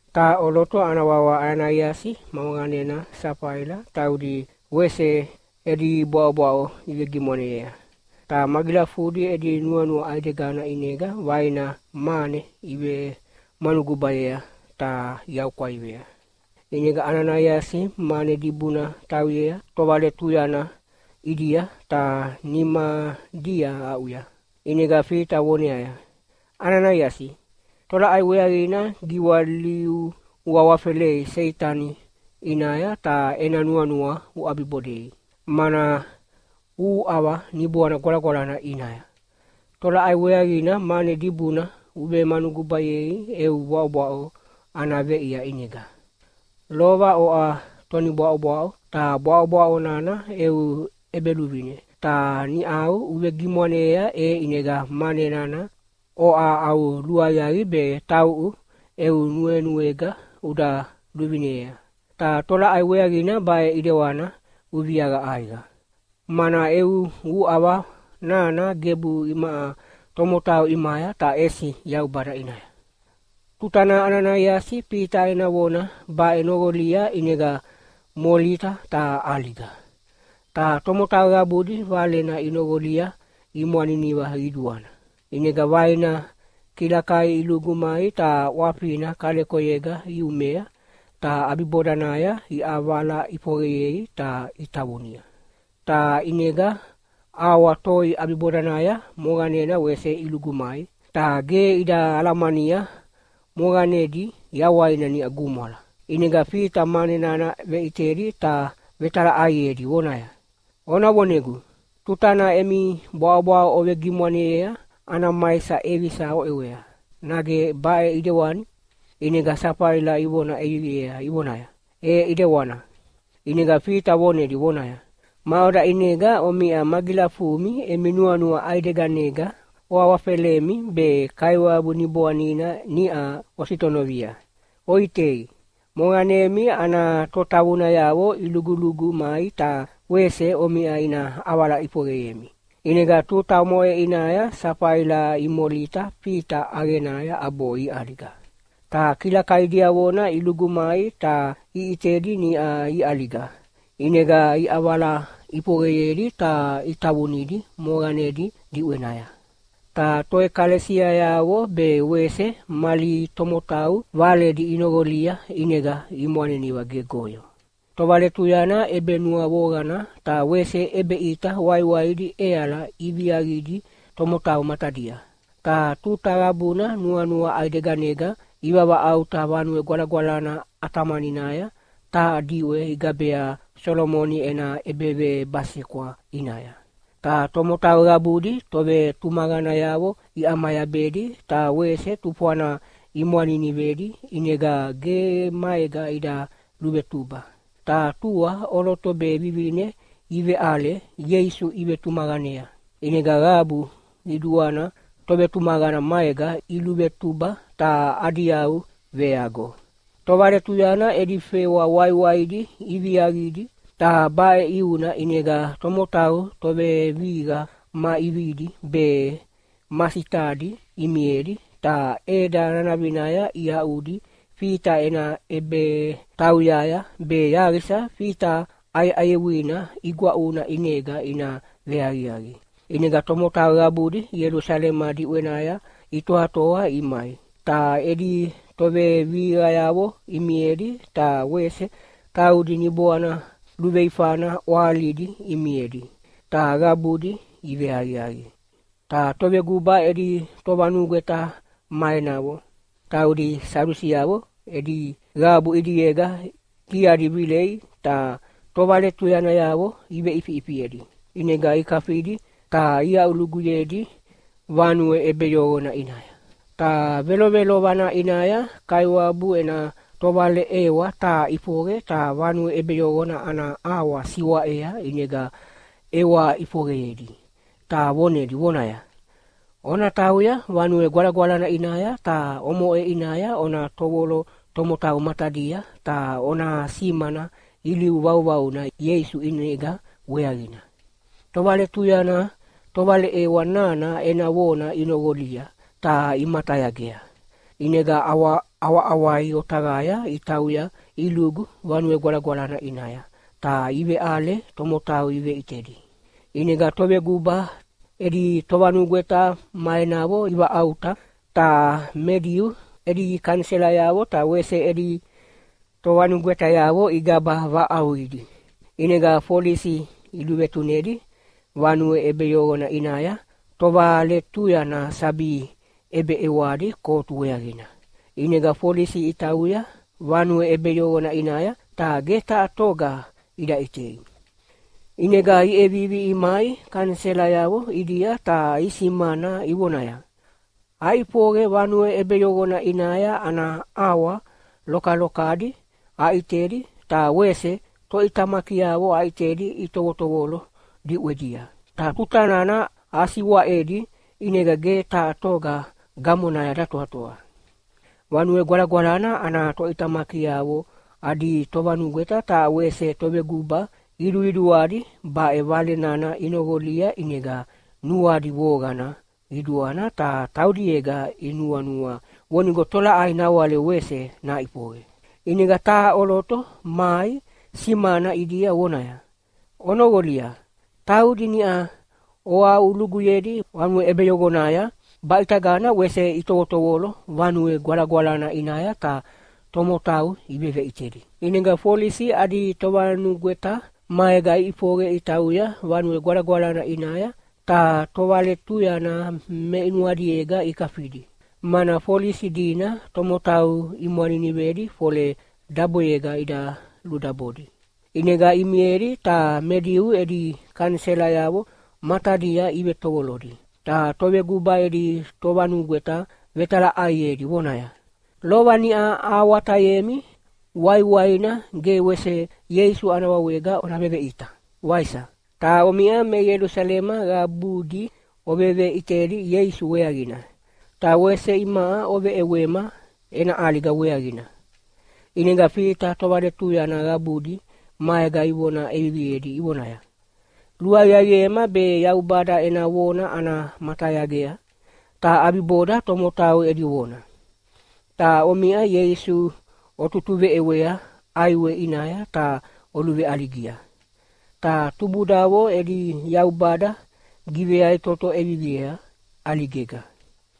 Taha ʼoloto ana wawa Ananaiasi ma moqanena Safaila taudi wese edi bwaʼobwaʼo ivegimwaneyea. Ta magilafudi edi nuanua ʼaidegana ʼinega vaina mane ivemanugubayea ta iaʼukwaivea. ʼInega Ananaiasi mane dibuna tauyea tovaletuyana ʼidia ta nimadia aʼuya. ʼInega Fita voneaya, “Ananaiasi, tolaʼai weaqina giwaliu uawafelei Seitani ʼinaya ta ena nuanua uʼabibodei, mana uhuʼava Niboana Gwalagwalana ʼinaya. Tolaʼai weaqina mane dibuna uvemanugubayei eu bwaʼobwaʼo ana veʼia ʼinega? Lova oʼa tonibwaʼobwaʼo ta bwaʼobwaʼo nana eu ʼebeluvine, ta niʼau uvegimwaneyea e ʼinega mane nana oʼa au luaqiaqi be tauʼu eu nuenuega uda luvinea. Ta tolaʼai weaqina baʼe ʼidewana uviaqa ʼaiqa? Mana eu uʼava nana gebu imaʼa tomotau ʼimaya, ta ʼesi Yaubada ʼinaya.” Tutana Ananaiasi Fita ena vona baʼe noqolia ʼinega molita ta ʼaliga. Ta tomotau qabudi valena inoqolia imwaniniva qiduana. ʼInega vaina kilakai ilugu mai ta ʼwafina kalekoyega iumea, ta ʼabibodanaya iʼavala ʼifoqeyei ta itavunia. Ta ʼinega auwa toi ʼabibodanaya moqanena wese ilugu mai. Ta ge ida alamania moqanedi yawaina niʼa gumwala. ʼInega Fita mane nana veʼitedi ta vetalaʼaiedi vonaya, “Ona vonegu, tutana emi bwaʼobwaʼo ovegimwaneyea ana maisa ʼevisa oʼewea, nage baʼe ʼidewani?” ʼInega Safaila ivona ʼeviviea ivonaya, “E ʼidewana.” ʼInega Fita vonedi vonaya, “Maʼoda ʼinega omiʼa magilafumi emi nuanua ʼaideganega oawafelemi be Kaiwabu Niboanina niʼa ositonovia? Oʼitei, moqanemi ana totavunayavo ilugulugu mai ta wese omiʼa ina ʼavala ʼifoqeyemi.” ʼInega tuta omoʼe ʼinaya Safaila imolita Fita ʼaqenaya ʼabo iʼaliga. Ta kilakai diavona ilugu mai ta iʼitedi niʼa iʼaliga, ʼinega iʼavala ʼifoqeyedi ta itavunidi moqanedi diʼwenaya. Ta toʼekalesiayavo be wese mali tomotau valedi inoqolia ʼinega imwaniniva gegoyo. Tovaletuyana ʼebenuavoqana ta wese ʼebeʼita waiwaidi ʼeala iviaqidi tomotau matadia. Ta tuta qabuna nuanua ʼaideganega ivavaʼauta Vanue Gwalagwalana ʼatamaninaya taha diʼwe igabea Solomoni ena ʼEbevebasekwa ʼinaya. Ta tomotau qabudi tovetumaqanayavo iʼamayabedi ta wese tufwana imwaninivedi ʼinega ge maega ida luvetuba. Ta tua ʼoloto be vivine iveʼale Ieisu ivetumaqanea, ʼinega qabu qiduana tovetumaqana maega iluvetuba ta adi yau veago. Tovaletuyana edi fewa waiwaidi iviaqidi, ta baʼe ʼiuna ʼinega tomotau tovevihiqa ma ʼividi be ma sitadi imiedi ta ʼeda nanavinaya iaʼudi Fita ena ʼebetauyaya be yaqisa Fita ʼayeʼayewina igwaʼuna ʼinega ina veaqiaqi. ʼInega tomotau qabudi Ielusalema diʼwenaya itoatoa imai, ta edi tovevihiqayavo imiedi ta wese taudi niboana luveifana ʼwahalidi imiedi, ta qabudi iveaqiaqi. Ta toveguba edi tovanugweta ma enavo, taudi Sadusiavo edi qabu ʼidiega diadi vilei ta tovaletuyanayavo iveʼifiʼifiedi. ʼInega ikafidi ta iaʼuluguyedi vanue ʼebeyoqona ʼinaya. Ta velovelovana ʼinaya Kaiwabu ena tovaleʼewa taha ʼifoqe ta vanue ʼebeyoqona ana ʼawa siwaʼea ʼinega ʼewa ʼifoqeyedi, ta vonedi vonaya, “Ona tauya Vanue Gwalagwalana ʼinaya ta omoʼe ʼinaya ona tovolo tomotau matadia ta ona simana ilivu vauvauna Ieisu ʼinega weaqina.” Tovaletuyana tovaleʼewa nana ena vona inoqolia, ta imatayagea. ʼInega ʼawaʼawai otaqaya itauya ilugu Vanue Gwalagwalana ʼinaya, ta iveʼale tomotau iveʼitedi. ʼInega toveguba edi tovanugweta ma enavo ivaʼauta. Ta me Diu edi kaniselayavo ta wese edi tovanugwetayavo igaba vaʼauqidi. ʼInega folisi iluvetunedi vanue ʼebeyoqona ʼinaya tovaletuyana sabi ʼebeʼewadi kotu weaqina. ʼInega folisi itauya vanue ʼebeyoqona ʼinaya, ta ge taha toga ida ʼitei. ʼInega iʼevivi imai kaniselayavo ʼidia ta isimana ivonaya, “Aʼifoqe vanue ʼebeyoqona ʼinaya ana ʼawa lokalokadi aʼitedi ta wese toʼitamakiavo aʼitedi itovotovolo diʼwedia. Ta tuta nana asiwaʼedi ʼinega ge taha toga gamonaya datoatoa.” Vanue Gwalagwalana ana toʼitamakiavo adi tovanugweta ta wese toveguba qiduqiduadi baʼe vale nana inoqolia ʼinega nuadi voqana qiduana ta taudiega inuanua vonigo tolaʼai nawale wese naʼifoqe. ʼInega taha ʼoloto mai simana ʼidia vonaya, “Onoqolia! Taudi niʼa oaʼuluguyedi vanue ʼebeyoqonaya baʼitagana wese itovotovolo Vanue Gwalagwalana ʼinaya ta tomotau iveveʼitedi.” ʼInega folisi adi tovanugweta maega iʼifoqe itauya Vanue Gwalagwalana ʼinaya ta tovaletuyana meʼinuadiega ikafidi, mana folisi dina tomotau imwaninivedi fole daboyega ida ludabodi. ʼInega imiedi ta me Diu edi kaniselayavo matadia ivetovolodi, ta toveguba edi tovanugweta vetalaʼaiedi vonaya, “Lova niʼa ahawatayemi waiwaina ge wese Ieisu ana wawega ona veveʼita, waisa? Ta omiʼa me Ielusalema qabudi oveveʼitedi Ieisu weaqina, ta wese imaʼa oveʼewema ena ʼaliga weaqina!” ʼInega Fita tovaletuyana qabudi maega ivona ʼeviviedi ivonaya, “Luaqiaqiema be Yaubada ena vona ana matayagea, ta ʼabiboda tomotau edi vona. Ta omiʼa Ieisu otutuveʼewea ʼaiwe ʼinaya ta oluveʼaligia. Ta tubudavo edi Yaubada giveyaʼitoto ʼeviviea ʼaligega.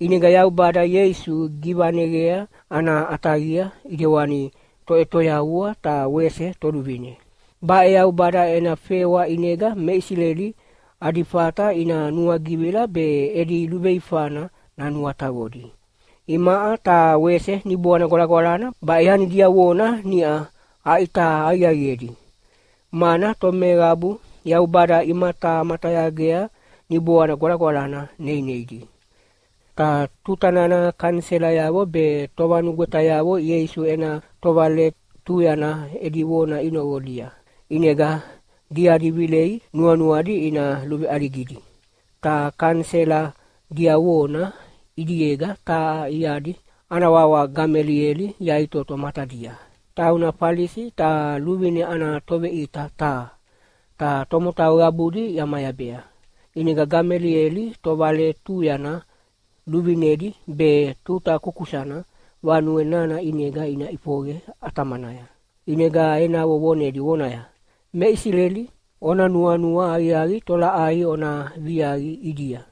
ʼInega Yaubada Ieisu givaneqea ana ʼataqia ʼidewani Toʼetoyavua ta wese Toluvine. Baʼe Yaubada ena fewa ʼinega me Isileli adi fata ina nuagivila be edi luveifana nanuataqodi. Imaʼa ta wese Niboana Gwalagwalana baʼe yani diavona niʼa aʼita aqiaqiedi, mana tomeqabu Yaubada imatamatayagea Niboanina Gwalagwalana neineidi.” Ta tuta nana kaniselayavo be tovanugwetayavo Ieisu ena tovaletuyana edi vona inoqolia, ʼinega diadi vilei nuanuadi ina luveʼaligidi. Ta kanisela diavona ʼidiega taha iadi ana wawa Gamelieli yaʼitoto matadia. Tauna Falisi ta luvine ana toveʼita taha, ta tomotau qabudi iʼamayabea. ʼInega Gamelieli tovaletuyana luvinedi be tuta kukusana vanue nana ʼinega ina ʼifoqe ʼatamanaya. ʼInega enavo vonedi vonaya, “Me Isileli, ona nuanua aqiaqi tolaʼai ona viaqi ʼidia.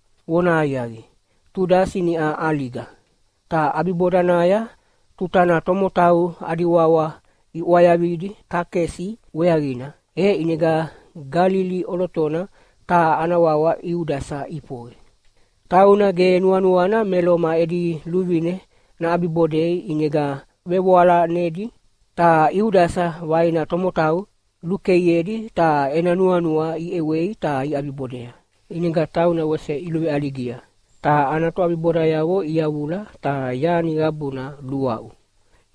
Vonahaqiaqi, Tudasi niʼa ʼaliga. Ta ʼabibodanaya tutana tomotau adi wawa iʼwayavidi takesi weaqina, e ʼinega Galili ʼolotona taha ana wawa Iudasa ʼifoqe. Tauna ge nuanuana me Loma edi luvine naʼabibodei ʼinega vevoalanedi. Ta Iudasa vaina tomotau lukeiedi ta ena nuanua iʼewei ta iʼabibodea. ʼInega tauna wese iluveʼaligia, ta ana toʼabibodayavo iyavula ta yani qabuna luaʼu.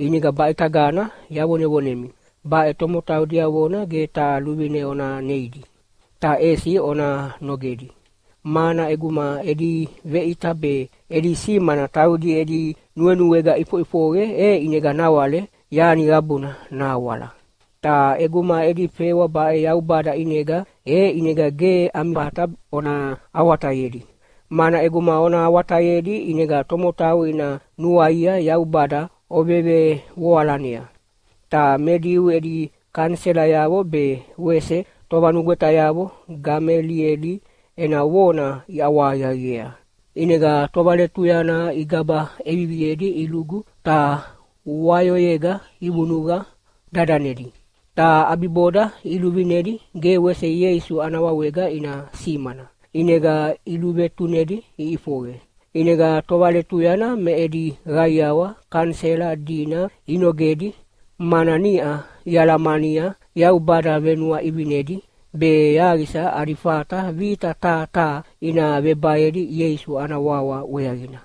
ʼInega baʼitagana yavonevonemi, baʼe tomotau diavona ge taha luvine ona neidi, ta ʼesi ona nogedi! Mana ʼeguma edi veʼita be edi simana taudi edi nuenuega ʼifoʼifoqe e ʼinega nawale yani qabuna nahawala. Ta ʼeguma edi fewa baʼe Yaubada ʼinega, e ʼinega ge ami fata ona awatayedi, mana ʼeguma ona awatayedi ʼinega tomotau ina nuaia Yaubada ovevevoalanea.” Ta Me Diu edi kaniselayavo be wese tovanugwetayavo Gamelieli ena vona iʼawahaqiaqiea. ʼInega tovaletuyana igaba ʼeviviedi ilugu ta wayoyega ivunuqa dadanedi. Ta ʼabiboda iluvinedi ge wese Ieisu ana wawega ina simana. ʼInega iluvetunedi iʼifoqe. ʼInega tovaletuyana me edi qaiawa kanisela dina inogedi, mana niʼa ialamania Yaubada venuaʼivinedi be yaqisa adi fata vita taha taha ina vebaedi Ieisu ana wawa weaqina.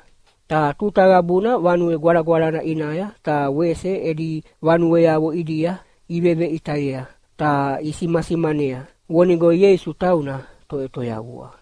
Ta tuta qabuna Vanue Gwalagwalana ʼinaya ta wese edi vanueavo ʼidia iveveʼitayea ta isimasimanea, vonigo Ieisu tauna Toʼetoyavua.